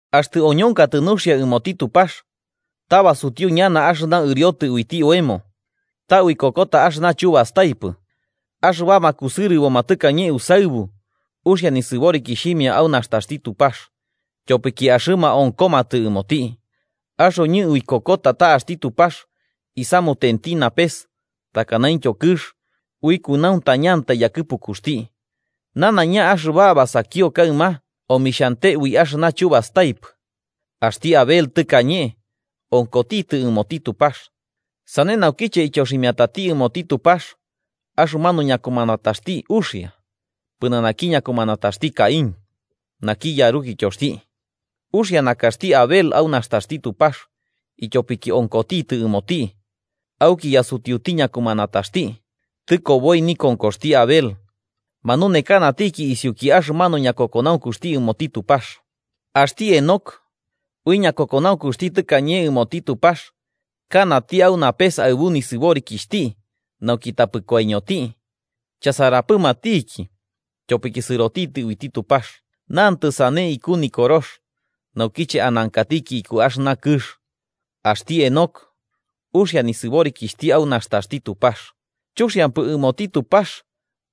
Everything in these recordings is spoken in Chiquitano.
Axtɨ oñonkatɨ nuxia ɨmoti Tupax, ta basutiu ñana axɨna ɨriotɨ uiti oemo. Ta uikokota axɨna chubastaipɨ. Axɨbama kusɨrɨboma tɨkañe usaɨbu uxia nisɨborikixhimia au nastaxti Tupax, tyopiki axɨma onkomatɨ ɨmoti. Axoñɨ uikokota ta axti Tupax isamutenti napes takanaintyo kɨx ui kunauntañantai yakɨpukuxti. Nanaiña axɨba basakio kaɨma omixhante ui axɨna chubastaipɨ. Axti Abel tɨkañe onkotitɨ ɨmoti Tupax. Sane naukiche ityoximiatati ɨmoti Tupax axɨmanu ñakumanataxti uxia pɨnanaki ñakumanataxti Caín, naki yarukityoxti. Uxia nakaxti Abel au nastaxti Tupax, ityopiki onkotitɨ ɨmoti, auki yasutiuti ñakumanataxti. Tɨkoboi nikonkoxti Abel, manunekanatiki isiuki axɨmanu ñakokonaunkuxti ɨmoti Tupax. Axti Henoc ui ñakokonaunkuxti tɨkañe ɨmoti Tupax kanati au napes aɨbu nisɨborikixhti nauki tapɨ koiñoti, chasaramapɨtiki, tyopiki sɨrotitɨ uiti Tupax. Nantɨ sane iku Nikorox, naukiche anankatiki iku axɨna kɨx. Axti Henoc uxia nisɨborikixhti au nastaxti Tupax. Chuxiampɨ ɨmoti Tupax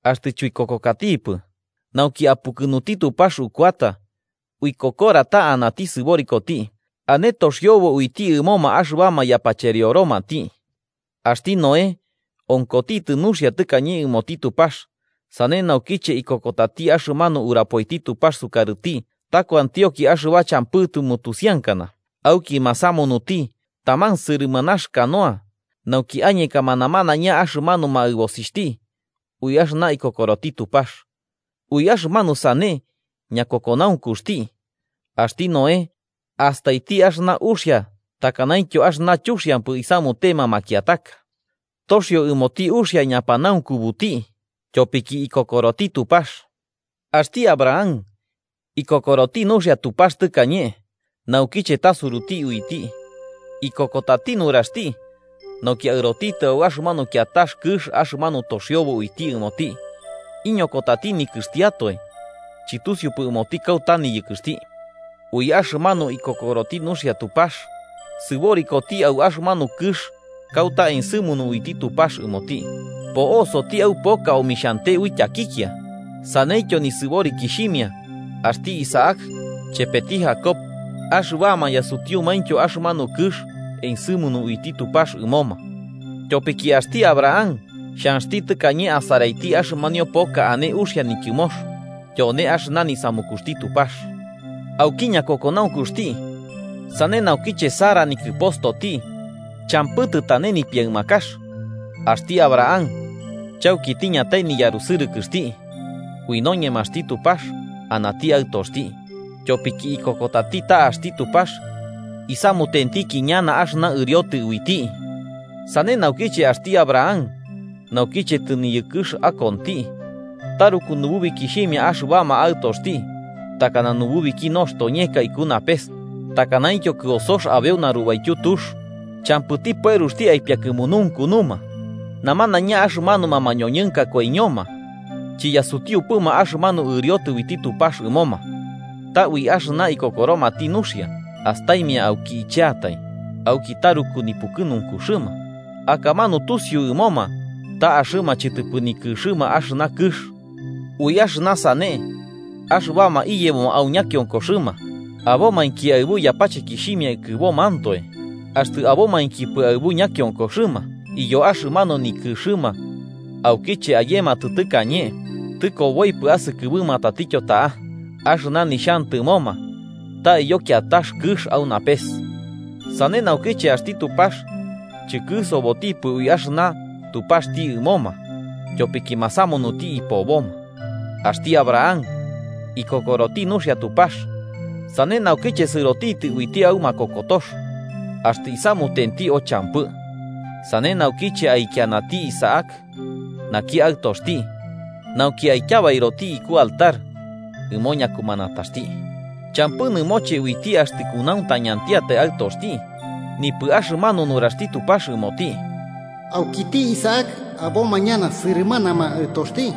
axtɨ chuikokokatipɨ, nauki apukɨnuti Tupax ukuata uikokora ta anati sɨborikoti, ane toxiobo uiti ɨmoma axɨbama yapacherioromati. Axti Noé onkotitɨ nuxia tɨkañe ɨmoti Tupax, sane naukiche ikokotati axɨmanu urapoiti Tupax sukarɨti ta kuantionki axɨba champɨ tɨmutusiankana, auki masamunuti taman sɨrɨmanax canoa nauki añekama namanaiña axɨmanuma aɨbosixhti ui axɨna ikokoroti Tupax, ui axɨmanu sane ñakokonaukuxti, axti Noé astaiti axɨna uxia takanaintyo axɨna chuxiampɨ isamutema makiataka toxio ɨmoti uxia ñapanaunkubuti tyopiki ikokoroti Tupax. Axti Abraham, ikokoroti nuxia Tupax tɨkañe naukiche tasuruti uiti, ikokotati nuraxti nauki aɨrotitɨ au axɨmanu kiatax kɨx axɨna toxiobo uiti ɨmoti. Iñokotati nikɨxtiatoe chɨtusiupɨ ɨmoti kauta niyɨkɨxti. Ui axɨmanu ikokoroti nuxia Tupax sɨborikoti au axɨmanu kɨx kauta ensɨmunu uiti Tupax ɨmoti. Po'osoti au poka omixhante ui tyakikia, saneityo nisɨborikixhimia axti Isaac chepeti Jacob, axɨbama yasutiumaintyo axɨmanu kɨx ensɨmunu uiti Tupax ɨmoma. Tyopiki axti Abraham xhanxti tɨkañe asaraiti axɨmanio poka ane uxia nityɨmox, tyone axɨna nisamukuxti Tupax. Auki ñakokonaunkuxti, sane naukiche Sara nikɨpostoti champɨ tɨtane nipiaɨmakax axti Abraham chauki tiñatai niyarusɨrɨkɨxti, ui noñemaxti Tupax anati aɨtoxti, tyopiki ikokotati ta axti Tupax isamutentiki ñana axɨna ɨriotɨ uiti. Sane naukiche axti Abraham naukiche tɨniyɨkɨx akonti, taruku nububikixhimia axɨbama aɨtoxti takana nububiki noxtoñeka iku napes takanaityo kɨosox abeu narubaityu tux, champɨti pueruxti aipiakɨmununkunuma. Namanaiña axɨmanuma mañoñɨnka koiñoma chiyasutiuma axɨmanu ɨriotɨ uiti Tupax ɨmoma. Ta ui axɨna ikokoromati nuxia, astaimia auki icheatai, auki taruku nipukɨruxɨma, akamanu tusiu ɨmoma, ta axɨma chɨtɨpɨ nikɨxɨma axɨna kɨx. Ui axɨna sane, axɨbama iyebo au ñakionkoxɨma abomainki aɨbu yapachekixhimia ikɨbomantoe. Axtɨ abomainkipɨ aɨbu ñakionkoxɨma iyo axɨmanu nikɨxɨma aukiche ayematɨ tɨkañe tɨkoboipɨ asɨkɨbɨma tatityo ta'a. Axɨna nixhantɨmoma ta iyo kiatax kɨx au napes. Sane naukiche axti Tupax chɨkɨsobotipɨ ui axɨna Tupaxti ɨmoma tyopiki masamunuti ipoboma. Axti Abraham ikokoroti nuxia Tupax, sane naukiche sɨroti uiti au makokotox axtɨ isamutenti o champɨ. Sane naukiche aikianati Isaac naki aɨtoxti nauki aityabairoti iku altar ɨmo ñakumanataxti. Champɨ nɨmoche uiti axtɨ kunauntañantiatai aɨtoxti, nipɨ axɨmanu nuraxti Tupax ɨmoti. “Aukiti Isaac aboma ñana sɨrɨmanama aɨtoxti.”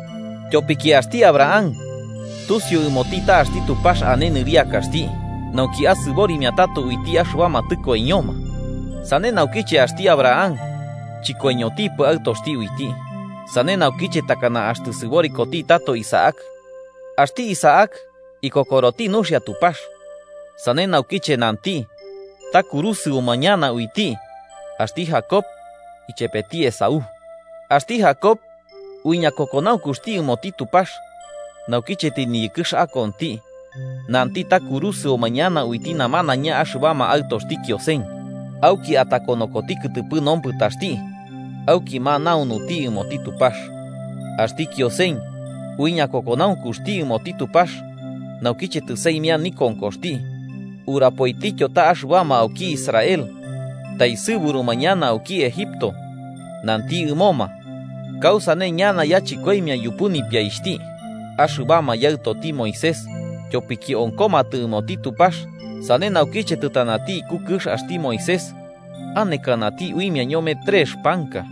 Tyopiki axti Abraham tusiu ɨmoti ta axti Tupax ane nɨriakaxti nauki asɨborimia tato uiti axɨbama tɨkoiñoma. Sane naukiche axti Abraham chɨkoiñotipɨ aɨtoxti uiti. Sane naukiche takana axtɨ sɨborikoti tato Isaac. Axti Isaac ikokoroti nuxia Tupax, sane naukiche nanti ta kurusɨuma ñana uiti axti Jacob chepeti Esaú. Axti Jacob, ui ñakokonaunkuxti ɨmoti Tupax, naukiche tɨniyɨkɨx akonti, nanti ta kurusɨoma ñana uiti namanaiña axɨbama aɨtoxti Kiosen. Auki atakonokoti kɨtɨpɨ nompɨtaxti auki manaunuti ɨmoti Tupax. Axti Kiosen ui ñakokonaunkuxti ɨmoti Tupax, naukiche tɨsaimia nikonkoxti, urapoitityo ta axɨbama auki Israel taesɨburuma ñana auki Egipto nanti ɨmoma kausane ñana yachɨkoimia yupu nipiaixhti. Axɨbama yaɨtoti Moisés tyopiki onkomatɨ ɨmoti Tupax, sane naukiche tɨtanati iku kɨx axti Moisés, anekanati uimia ñome trex panka.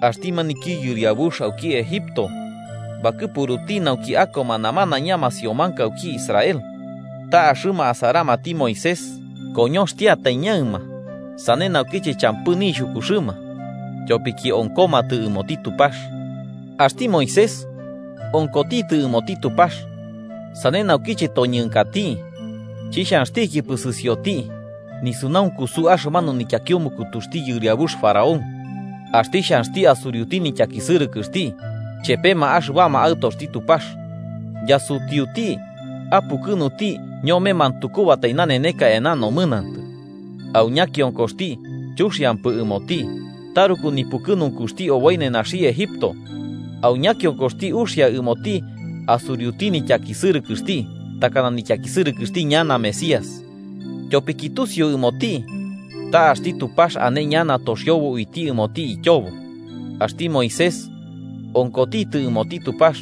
Axti maniki yɨriabux auki Egipto bakɨpuruti nauki akoma namanaiña masiomanka auki Israel, ta axɨma asaramati Moisés koñoxtiatai ñaɨma sane naukiche champɨ nixhukuxɨma, tyopiki onkomatɨ ɨmoti Tupax. Axti Moisés, onkotitɨ ɨmoti Tupax, sane naukiche toñɨnkati, chixhanxtikipɨ sɨsioti nisunaunkusu axɨmanu nityakiumukutuxti yɨriabux faraón. Axti xhanxti asuriuti nityakisɨrɨkɨxti chepema axɨbama aɨtoxti Tupax, yasutiuti apukɨnuti ñome mantukubatai naneneka eana nomɨnantɨ. Au ñakionkoxti chuxiampɨ ɨmoti taruku nipukɨnunkuxti oboi nenaxi Egipto, au ñakionkoxti uxia ɨmoti asuriuti nityakisɨrɨkɨxti takana nityakisɨrɨkɨxti ñana Mesías. Tyopiki tusiu ɨmoti ta axti Tupax ane ñana toxiobo uiti ɨmoti ityobo. Axti Moisés onkotitɨ ɨmoti Tupax,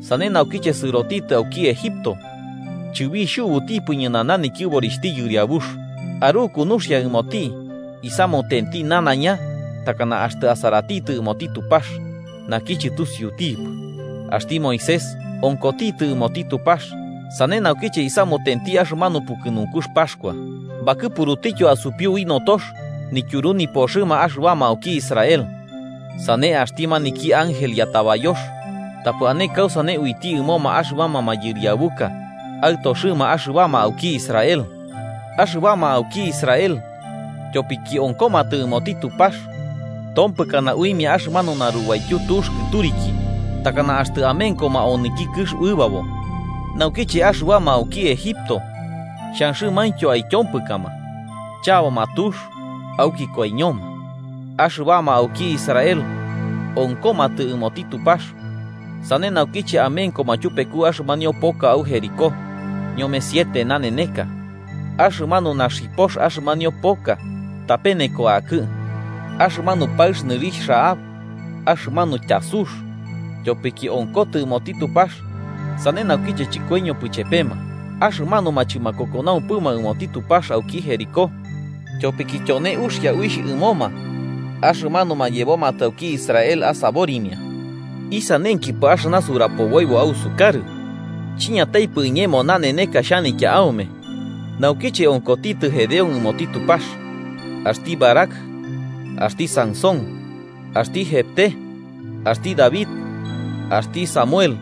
sane naukiche sɨrotitɨ auki Egipto, chɨbixhubutipɨ ñɨnana nityɨborixhti yɨriabux. Aruku nuxia ɨmoti, isamutenti nanaiña takana axtɨ asaratitɨ ɨmoti Tupax naki chɨtusiutipɨ. Axti Moisés onkotitɨ ɨmoti Tupax, sane naukiche isamutenti axɨmanu pukɨnunkux Paxkua. Bakɨpurutityo asupiu ui notox nityuru nipoxɨma axɨbama auki Israel. Sane axti maniki ángel yatabayox tapɨ ane kausane uiti ɨmoma axɨbama mayɨriabuka aɨtoxɨma axɨbama auki Israel. Axɨbama auki Israel tyopiki onkomatɨ ɨmoti Tupax, tompɨkana uimia axɨmanu narubaityu tux kɨturiki takana axtɨ amenkoma onɨki kɨx uɨbabo. Naukiche axɨbama auki Egipto xhanxɨmaintyo aityompɨkama, chaboma tux auki koiñoma. Axɨbama auki Israel onkomatɨ ɨmoti Tupax, sane naukiche amenkoma tyupeku axɨmanio poka au Jericó ñome siete naneneka, axɨmanu naxipox axɨmanio poka tapeneko akɨ. Axɨmanu paɨx nɨrixh Rahab, axɨmanu tyasux, tyopiki onkotɨ ɨmoti Tupax, sane naukiche chɨkoiñopɨ chepema axɨmanuma chɨmakokonaumpɨma ɨmoti Tupax auki Jericó, tyopiki tyone uxia uixh ɨmoma axɨmanuma yebomatɨ auki Israel asaborimia. ¿Isanenkipɨ axɨna surapoboibo ausukarɨ? Chiñataipɨ iñemo naneneka xhanitya aume naukiche onkotitɨ Gedeón ɨmoti Tupax, axti Barac, axti Sansón, axti Jefté, axti David, axti Samuel,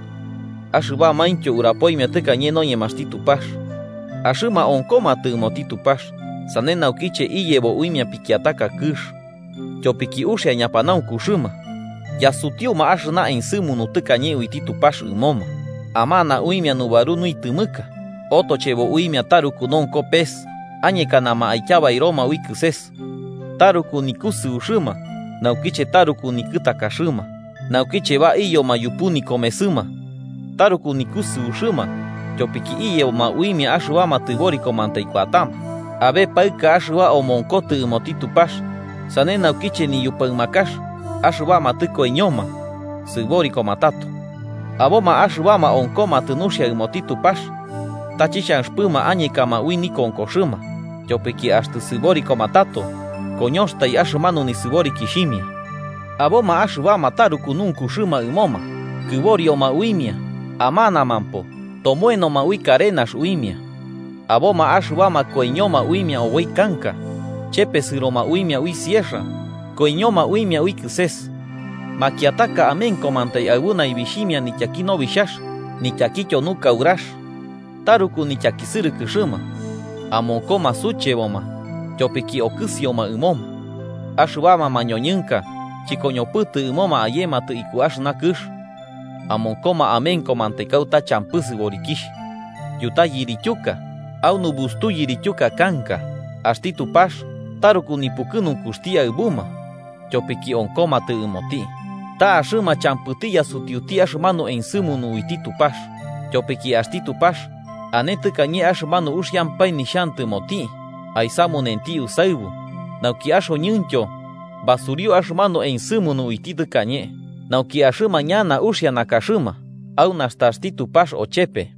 axɨbamaintyo urapoimia tɨkañe noñemaxti Tupax. Axɨma onkomatɨ ɨmoti Tupax, sane naukiche iyebo uimia pikiataka kɨx. Tyopiki uxia ñapanaunkuxɨma. Yasutiuma axɨna ensɨmunu tɨkañe uiti Tupax ɨmoma. Amana uimia nubaru nuitɨmɨka, otochebo uimia taruku nonko pes, añekanama aityabairoma ui kɨses, taruku nikusɨuxɨma naukiche taruku nikɨtakaxɨma, naukiche baiyoma yupu nikomesɨma taruku nikusɨuxɨma tyopiki iyeboma uimia axɨbama tɨborikomantai kuatama. Abe paɨka axɨba omonkotɨ ɨmoti Tupax, sane naukiche niñupaɨmakax axɨbama tɨkoiñoma sɨborikoma tato. Aboma axɨbama onkomatɨ nuxia ɨmoti Tupax ta chixhanxɨpɨma añekama ui nikonkoxɨma tyopiki axtɨ sɨborikoma tato koñoxatai axɨmanu nisɨborikixhimia. Aboma axɨbama taruku nunkuxɨma ɨmoma, kɨborioma uimia, amanamampo tomoenoma ui karenax uimia. Aboma axɨbama koiñoma uimia oboi kanka, chepesɨroma uimia ui sierra, koiñoma uimia ui kɨses. Makiataka amenkomantai aɨbu naibixhimia nityaki nobixhax nityakityo nukaurax. Taruku nityakisɨrɨkɨxɨma, amonkoma sucheboma, tyopiki okɨsioma ɨmoma. Axɨbama mañoñɨnka chɨkoñopɨtɨ ɨmoma ayematɨ iku axɨna kɨx, amonkoma amenkomantai kauta champɨ sɨborikixh, yuta yirityuka, au nubustu yirityuka kanka. Axti Tupax taruku nipukɨnunkuxti aɨbuma, tyopiki onkomatɨ ɨmoti. Ta axɨma champɨti yasutiuti axɨmanu ensɨmunu uiti Tupax. Tyopiki axti Tupax ane tɨkañe axɨmanu uxiampae nixhantɨmoti aisamunenti usaɨbu, nauki axoñɨntyo basuriu axɨmanu ensɨmunu uiti tɨkañe. Nauki axɨma ñana uxia nakaxɨma au nastaxti Tupax ochepe.